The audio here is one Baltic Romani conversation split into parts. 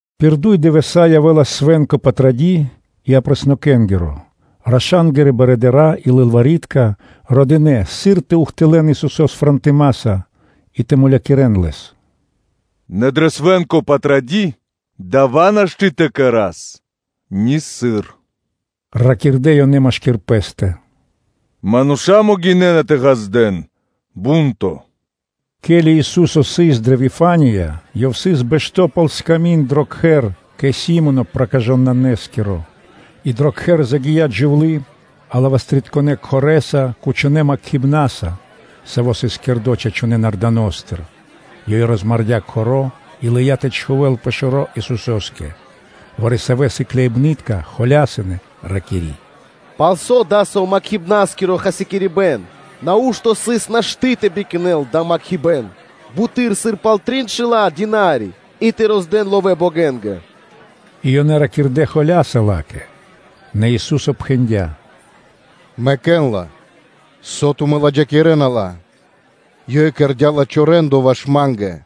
Пир дуй дывэса́ явэ́лас свэ́нко Патради́ и Апреснокэнгиро; раша́нгирэ барыдыра́ и лылвари́тка дыкхнэ́ ракхибны́ткэс, сыр тэ ухтылэ́н Исусо́с фрэнтымаса и тэ мулякирэ́н Лэс. “Нэ пэ свэ́нко Патради́ дава́ нашты́ тэ кэра́с нисыр, – ракирдэ́ ёнэ машки́р пэ́стэ, – мануша́ могинэ́на тэ ґаздэ́н бу́нто.” Ке́ли Ису́со сыс дрэ Вифания, Ёв сыс бэшто́ пал сками́нд дро кхэр кэ Си́моно Проказытконэскиро, и дро кхэр загия́ джувлы́ алибастрытконэ кхорэса (жбаноса) кучонэ́ макхибнаса, саво́ сыс кэрдо́ чачунэ́ нарданостыр. Ёй розмардя́ кхоро́ и лыя́ тэ чхувэ́л пэ шэро́ Исусо́скэ. Вари-савэ́ сыкляибны́тка холясынэ, ракири́: “Палсо́ дасаво макхибнаскиро хасякирибэн! Нау́што (ужэли) сыс нашты́ тэ бикнэл дава́ макхибэн буты́р сыр пал триншэла́ динарии и тэ роздэн ловэ́ богэнгэ.” И ёнэ ракирдэ́ холя́са ла́кэ. Нэ Ису́со пхэндя́: “Мэкэ́н ла, со тумэ́ кэрэ́на пхаро́ ла́кэ. Ёй кэрдя́ лачхо́ рэ́ндо ваш Ма́нгэ.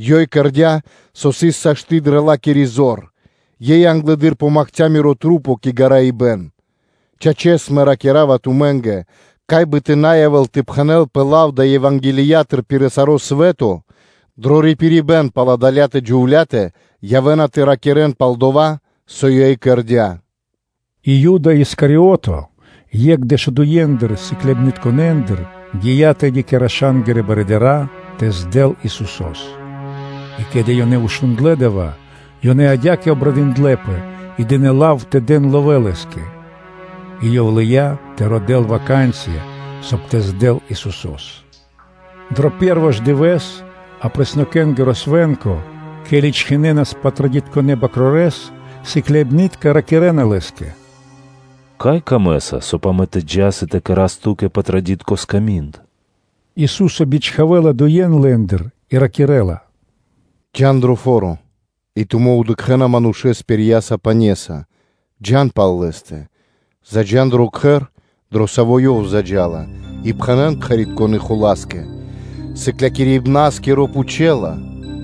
Ёй кэрдя́, со сыс сашты́ дрэ ла́кири зор, ёй англэды́р помакхця Мирэ́ маса́ кэ гараибэн. Чачэс, Мэ ракира́ва тумэ́нгэ: кай бы тэ на явэ́л тэ пхэнэлпэ лав далэ́ Евангелиятыр пир саро́ свэ́то, дро рипирибэ́н пал адалятэ джувля́тэ явэ́на тэ ракирэ́н пал дова́, со ёй кэрдя́.” И Юда Искариото, екх дэшудуендыр сыкляибнытконэндыр, гия́ тэды кэ раша́нгирэ барыдыра́ тэ здэл Исусо́с. И ке́ли ёнэ шундлэ́ дава́, ёнэ адя́кэ обрадындлэпэ и дынэ́ лав тэ дэн ловэ́ лэ́скэ. И ёв лыя́ тэ родэ́л ваканцыя (случаё), соб (кай) тэ здэл Исусо́с. Дро пэ́рво ж дывэ́с Апреснокэнгиро Свэ́нко, ке́ли чхинэнас Патрадитконэ бакрорэс, сыкляибны́тка ракирэ́на Лэ́скэ: “Кай Ту́кэ исын пир ило́, соб (кай) амэ тэ джас и тэ кэра́с Ту́кэ патрадитко сками́нд?” Ису́со бичхавэ́ла дуе́н лэ́ндыр и ракирэ́ла: “Джа́н дро фо́ро; и тумэ́ дыкхэ́на манушэ́с пирьяса пане́са, джа́н пал лэ́стэ, и заджа́н дро кхэр, дро саво́ ёв заджа́ла, и пхэнэ́н кхэритконэ́ хула́скэ: “Сыклякирибна́скиро пхучэла: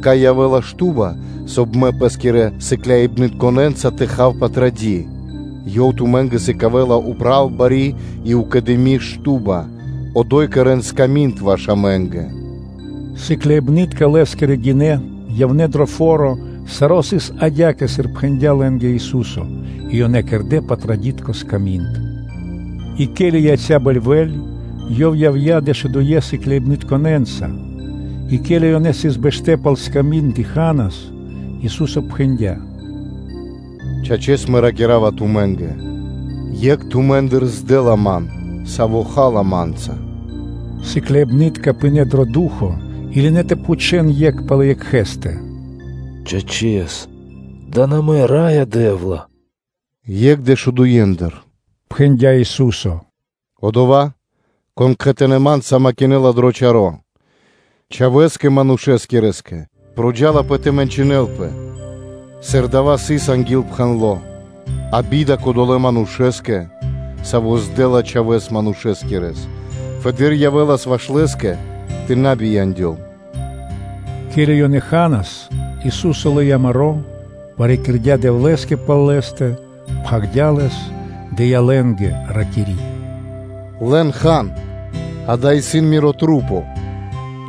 кай явэ́ла шту́ба, соб (кай) Мэ Пэ́скирэ сыкляибнытконэ́нца тэ хав Патради́?” Ёв тумэ́нгэ сыкавэ́ла упратуны бари шука́р шту́ба; одо́й кэрэ́н сками́нд ваш амэ́нгэ”.” Сыкляибны́тка Лэ́скирэ гинэ́, явнэ́ дро фо́ро; саро́ сыс адя́кэ, сыр пхэндя́ лэ́нгэ Ису́со, и ёнэ кэрдэ́ патрадитко сками́нд. И ке́ли яця́ бэльвэ́ль, Ёв явдя́ дэшудуе́ сыкляибнытконэ́нца. И ке́ли ёнэ сыс бэштэ́ пал сками́нд и ханас, Ису́со пхэндя́: “Чачэс, Мэ ракира́ва тумэ́нгэ: екх тумэ́ндыр здэла Ман, саво́ ха́ла Ма́нца.” Сыкляибны́тка пынэ́ дро ду́хо (фа́но), и лынэ́ тэ пхучэ́н екх палэ екхэ́стэ: “Чачэс, дава́ на мэ, Раё Дэ́вла?” “Екх дэшудуендыр”, – пхэндя́ Ису́со, – “одова́, кон кхэтанэ́ Ма́нца макинэла дро чаро́. Чхавэ́скэ Манушэскирэскэ проджалапэ тэ мэнчынэлэпэ, сыр дава́ сыс анги́л пхэндло́, а би́да кодолэ́ манушэ́скэ, саво́ здэла Чхавэ́с Манушэскирэс! Фэды́р явэ́лас ваш лэ́скэ тэ на бияндёл.” Ке́ли ёнэ ханас, Ису́со лыя́ маро́, парикирдя Дэвлэ́скэ пал лэ́стэ, пхагирдя́ лэс, дыя́ лэ́нгэ, ракири́: “Лэн, хан; акэ, исын Мирэ́ маса́.”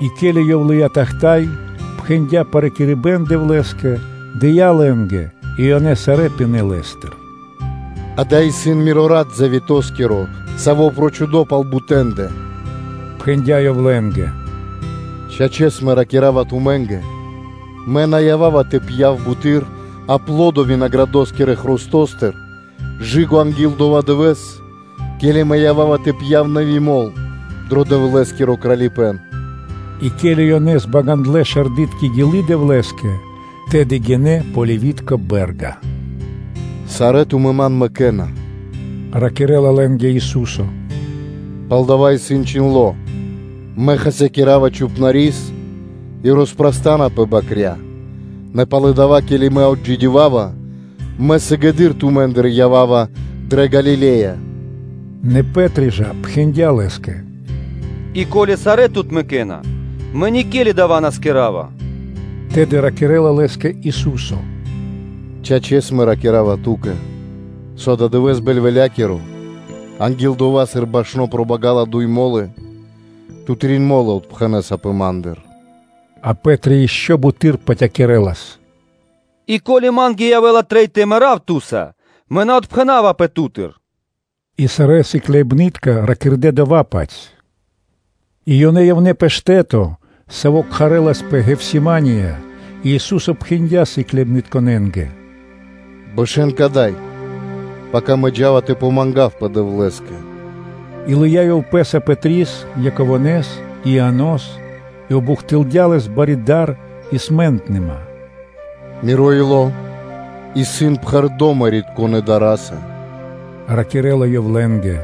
И ке́ли Ёв лыя́ тахта́й (чаша), пхэндя́ парикирибэн Дэвлэ́скэ, дыя́ лэ́нгэ и ёнэ сарэ́ пинэ́ лэ́стыр. “Акэ, исын Миро рат завето́скиро, саво́ прочхудо пал бутэндэ”, – пхэндя́ Ёв лэ́нгэ. “Чачэс, Мэ ракира́ва тумэ́нгэ: Мэ на ява́ва тэ пья́в буты́р аплодо винаградоскирэ хрустостыр анги́л дова́ дывэ́с, ке́ли Мэ ява́ва тэ пья́в нэви́ мол (вино) дро Дэвлэ́скиро Кралипэ́н.” И ке́ли ёнэ збагандлэ шардытко гилы́ Дэвлэ́скэ, тэды гинэ́ пэ Оливи́тко Бэ́рга. “Сарэ́ тумэ́ Ма́ндыр отпэрэна”, – ракирэ́ла лэ́нгэ Ису́со, – палдава́ исын чхиндло́: ‘Мэ хасякира́ва Чхупнарис и роспрастанапэ бакря́;’ нэ пало́ дава́, ке́ли Мэ отджидёвава, Мэ сыгэды́р тумэ́ндыр ява́ва дрэ Галиле́я.’” Нэ Пэ́три жа пхэндя́ Лэ́скэ: “И ко́ли сарэ́ Ту́тыр отпэрэна-мэ никели дава́ на кэра́ва.” Тэды ракирэ́ла Лэ́скэ Ису́со: “Чачэс, Мэ ракира́ва Ту́кэ, со ададывэ́с бэльвэлякиро, анги́л дова́, сыр башно пробагала дуй мо́лы, ту трин мо́лы отпхэнэсапэ Ма́ндыр.” А Пэ́три ишчо (инкэ́) буты́р патякирэлас: “И ко́ли ма́нгэ явэ́ла трэй тэ мэрав Ту́са, мэ на отпхэнавапэ Ту́тыр.” И сарэ́ сыкляибны́тка ракирдэ́ дова́-паць. И ёнэ явнэ́ пэ штэ́то, саво́ кхарэ́лапэ Гефсимания и Ису́со пхэндя́ сыкляибнытконэ́нгэ: “Бэшэ́н кадай, пака Мэ джа́ва тэ мангавпэ Дэвлэ́скэ.” И лыя́ Ёв пэ́са Пэтрис, Яково́с и Ианос, и обухтылдя Лэс бари дар и смэнтныма. “Миро ило́ исын пхэрдо́ мэрибнытконэ дара́са”, – ракирэ́ла Ёв лэ́нгэ,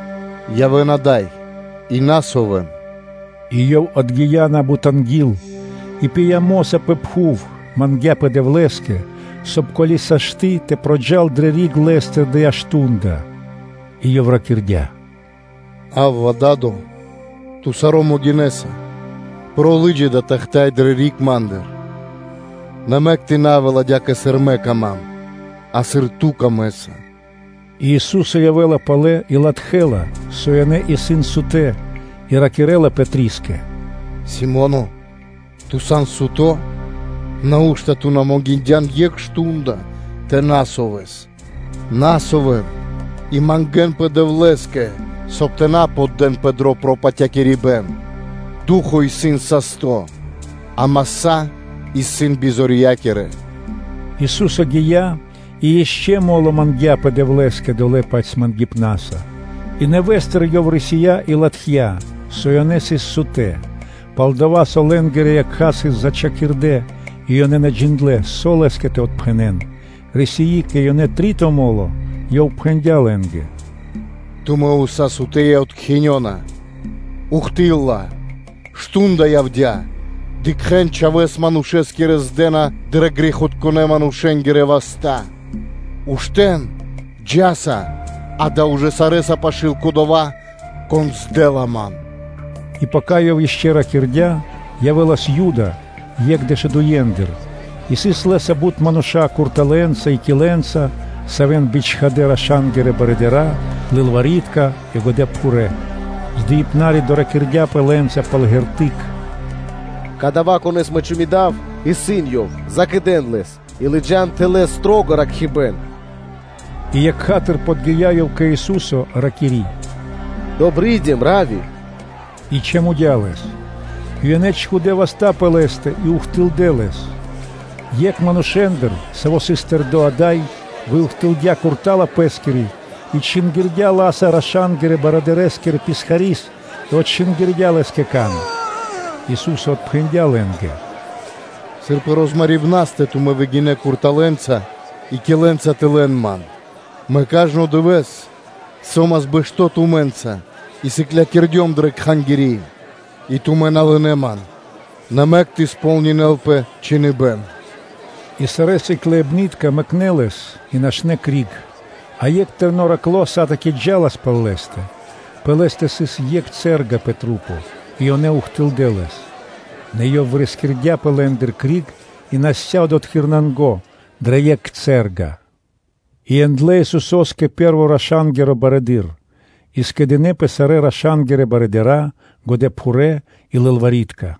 – “явэ́н ада́й, и ракхэ́нпэ [на совэн-р.с.].” И Ёв отгия́ на́бут анги́л, и пыя́ мо́са пэ пхув, мангдя́пэ Дэвлэ́скэ, соб (кай), ко́ли сашты́ (можна), тэ проджал (накхэл) дрэ риг Лэ́стыр дава́ мардо́ (шту́нда); и Ёв ракирдя́: “Авва, Да́до! Ту саро́ могинэ́са. Лы́джа дава́ тахта́й (чаша) дрэ риг Ма́ндыр; а мэк тэ на явэ́л адя́кэ, сыр Ма́нгэ исын пир ило́, а сыр исын Ту́кэ пир ило́.” И Ису́со явэ́ла палэ и латхэ́ла, со ёнэ исын сутэ́, и ракирэ́ла Пэтрискэ: “Симоне, ту сан суто́? Нау́што ту на могиндян екх мардо́ тэ ракхэспэ [тэ на совэс-р.с.]? Ракхэ́нпэ (на совэн) и мангэ́нпэ Дэвлэ́скэ, соб (кай) тэ на поддэнпэ дро пропатакирибэн; ду́хо (фа́но) исын састо́, а маса́ исын бизорья́кирэ.” Ису́со гия́ и ишчо (инкэ́) мо́ло мангдя́пэ Дэвлэ́скэ долэ́-паць мангипнаса (патерьяса). И нэвэ́стыр Ёв рисия́ и латхя́, со ёнэ сыс сутэ́, пал-дова́ со лэ́нгирэ якха́ сыс зачхакирдэ и ёнэ на джиндлэ́, со Лэ́скэ тэ отпхэнэн. Рисии кэ ёнэ дро три́то мо́ло, Ёв пхэндя́ лэ́нгэ: “Тумэ́ уса́ сан сутэ́ и откхинёна. Ухты́лла (до́си)! Мардо́ явдя́: дыкхэ́н, Чхавэ́с Манушэскирэс здэна дрэ грэхитконэ́-манушэ́нгирэ васта́. Уштэ́н, джа́са! Акэ, ужэ сарэ́са пашы́л исын кодова́, кон здэла Ман!” И пака Ёв ишчо (инкэ́) ракирдя́, явэ́лас Юда, екх дэшудуендыр, и сыс лэ́са бут мануша́ курталэнца и килэнца, савэ́н бичхадэ́ раша́нгирэ барыдыра́, лылвари́тка и годэпхурэ́. Здыибнари доракирдяпэ лэ́нца пал шпэ́ра (знако): “Кадава́, Конэ́с мэ чамудава, исын Ёв; закэдэн Лэс и лыджа́н тэл ракхибэн.” И екха́тыр подги́я ёв кэ Ису́со, ракири́: “Добридим, Равви!” И чамудя Лэс. И ёнэ чхудэ́ васта́ пэ Лэ́стэ и ухтылдэ́ Лэс. Екх манушэ́ндыр, саво́ сыс тэрдо́ ада́й, выухтылдя курта́ла пэ́скири и чингирдя ла́са раша́нгирэ барыдырэскирэ писхари́с и отчингирдя лэ́скэ кан. Ису́со отпхэндя́ лэ́нгэ: “Сыр пэ розмарибнаристэ тумэ́ выгинэ́ курталэнца и килэнца тэ лэн Ман? Мэ кажно дывэ́с со́мас бэшто́ тумэ́нца и сыклякирдём дрэ Кхангири́ и тумэ́ на лынэ́ Ман; нэ мэк тэ сполнинэ́лпэ Чхиныбэ́н.” И сарэ́ сыкляибны́тка мэкнэ́ Лэс и нашнэ́ криг. А екх тэрно́ ману́ш сатаки джа́лас пал Лэ́стэ: пэ лэ́стэ сыс екх цэ́рга пэ псикэ́ и ёнэ ухтылдэ́ лэс. Нэ ёв вырискирдяпэ лэ́ндыр криг и насця одотхы́р нанго (дрэ екх цэ́рга). И яндлэ́ Исусо́с кэ пэ́рво раша́нгиро барыдыро́: и скэдынэ́пэ сарэ́ раша́нгирэ барыдыра́, годэпхурэ́ и лылвари́тка.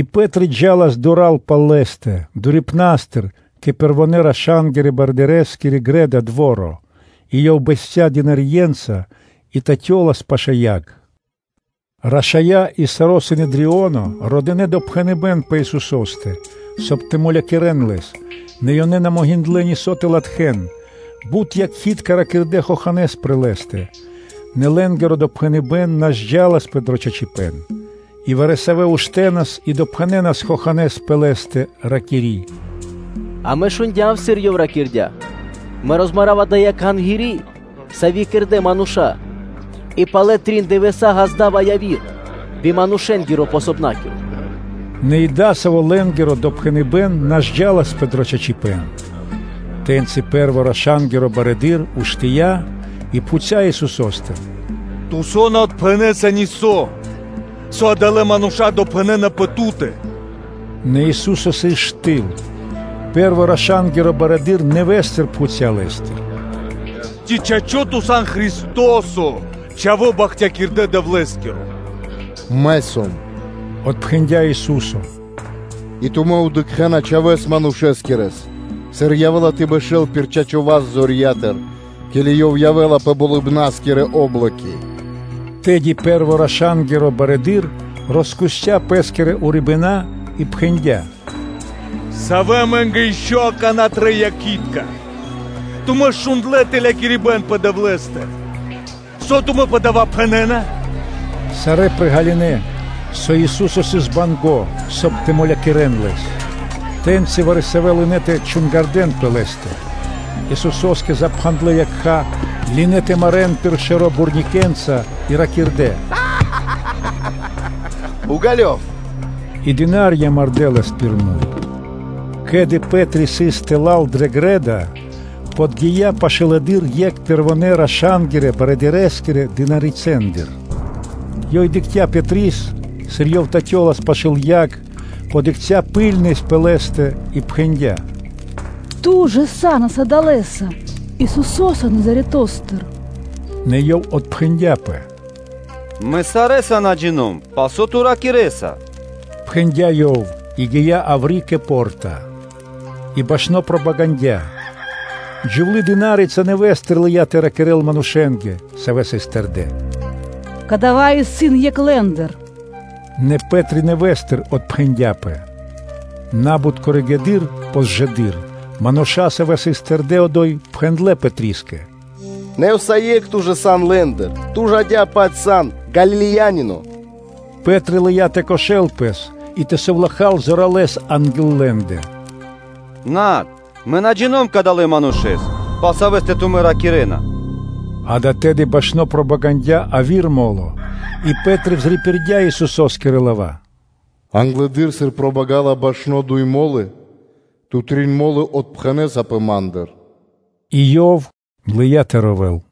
И Пэ́три джа́лас дура́л пал Лэ́стэ дурипнастыр кэ пэрвонэ́-раша́нгирэ барыдырэскири грэ́да (дво́ро); и ёв бэсця́ слугэ́нца (дынарье́нца) и татёлас пашы́л яг. Рашая́ и саро́ Синедрионо родынэ допхэныбэ́н пэ Исусо́стэ, соб (кай) тэ мулякирэ́н Лэс, нэ ёнэ на могиндлэ́ нисо́ тэ латхэ́н. Бут якхи́тка (свидетели) ракирдэ́ хоханэ́с пэ Лэ́стэ, нэ лэ́нгиро допхэныбэ́н на зджаласпэ дро чачипэ́н. И вари-савэ́ уштэнас и допхэнэнас хоханэ́с пэ Лэ́стэ, ракири́: “Амэ шундя́м, сыр Ёв ракирдя́: ‘Мэ роспхагирава дая́ Кхангири́, сави́ кэрдэ́ мануша́, и палэ трин дывэса́ ґазда́ва яви́р кхангири́ би манушэ́нгирэ вастэнгиро?’” Нэ и дасаво лэ́нгиро допхэныбэ́н на зджаласпэ дро чачипэ́н. Тэ́ньци пэ́рво раша́нгиро барыдыро́ уштыя́ и пхуця́ Исусо́стыр: “Ту со на отпхэнэса нисо́? Со адалэ́ мануша́ допхэнэна пэ Ту́тэ!” Нэ Ису́со сыс штыл. Пэ́рво раша́нгиро барыдыро́ нэвэ́стыр пхуця́ Лэ́стыр: “Ци, чачо́, Ту сан Христо́со, Чхаво́ Бахтякирдэ Дэвлэ́скиро?” “Мэ сом”, – отпхэндя́ Ису́со, – и тумэ́ дыкхэ́на Чхавэ́с Манушэскирэс, сыр Ёв явэ́ла тэ бэшэ́л пир чачо́ васт зорья́тыр, ке́ли Ёв явэ́ла пэ болыбна́скирэ о́блоки.” Тэды пэ́рво раша́нгиро барыдыро́ роскусця пэ́скирэ урибэна́ и пхэндя́: “Савэ амэ́нгэ ишчо (инкэ́) акана́ трэй якхи́тка? Тумэ́ ж шундлэ́ тэлякирибэн пэ Дэвлэ́стэ? Со тумэ́ пэ дава́ пхэнэ́на?” Сарэ́ приґалынэ, со Ису́со сыс банго́, соб (кай) тэ мулякирэ́н Лэс. Тэ́ньци вари-савэ́ лынэ́ тэ чунгардэн пэ Лэ́стэ; Исусо́скэ запхандлэ якха́, лынэ́ тэ марэ́н пир шэро́ бурныкэнца (ладошкэнца) и ракирдэ́: “Уґалёв!”; и слу́ги (дына́рья) мардэ́ Лэс пир муй. Ке́ли Пэ́три сыс тэла́л пэ грэ́да (пэ дво́ро), подги́я пашылэды́р екх пэрвонэ́-раша́нгирэ барыдырэскирэ дынарицэндыр. Ёй дыкхця́ Пэтрис, сыр ёв татёлас пашы́л яг, ракхибны́ткэс дыкхця́ пэ лэ́стэ и пхэндя́: “Ту жа са́нас адалэса Исусо́са Назаретостыр?” Нэ Ёв отпхэндяпэ: “Мэ сарэ́са на джино́м (на джина́в), пал со ту ракирэ́са”, – пхэндя́ ёв и гия́ яври́ кэ по́рта; и башно пробагандя. Джувлы́-дына́рица нэвэ́стыр лыя́ тэ ракирэ́л манушэ́нгэ, савэ́ сыс тэрдэ́: “Кадава́ исын екх лэ́ндыр.” Нэ Пэ́три нэвэ́стыр отпхэндяпэ. На́бут коригэды́р (позжэды́р) мануша́, савэ́ сыс тэрдэ́ одо́й, пхэндлэ́ Пэтрискэ: “Нэ, усае́кх, ту ж сан лэ́ндыр, ту ж адя-паць сан Галилеянино.” Пэ́три лыя́ тэ кошэл пэс, и тэ совлахал: “Над, мэ на джино́м кадалэ́ Манушэ́с, пал Савэ́стэ тумэ́ ракирэ́на.” Акэ, тэды башно пробагандя яви́р мо́ло, и Пэ́три пририпирдя Исусо́скирэ лава́: “Англэды́р, сыр пробагала башно дуй мо́лы, ту трин мо́лы отпхэнэсапэ Ма́ндыр.” И ёв лыя́ тэ ровэл.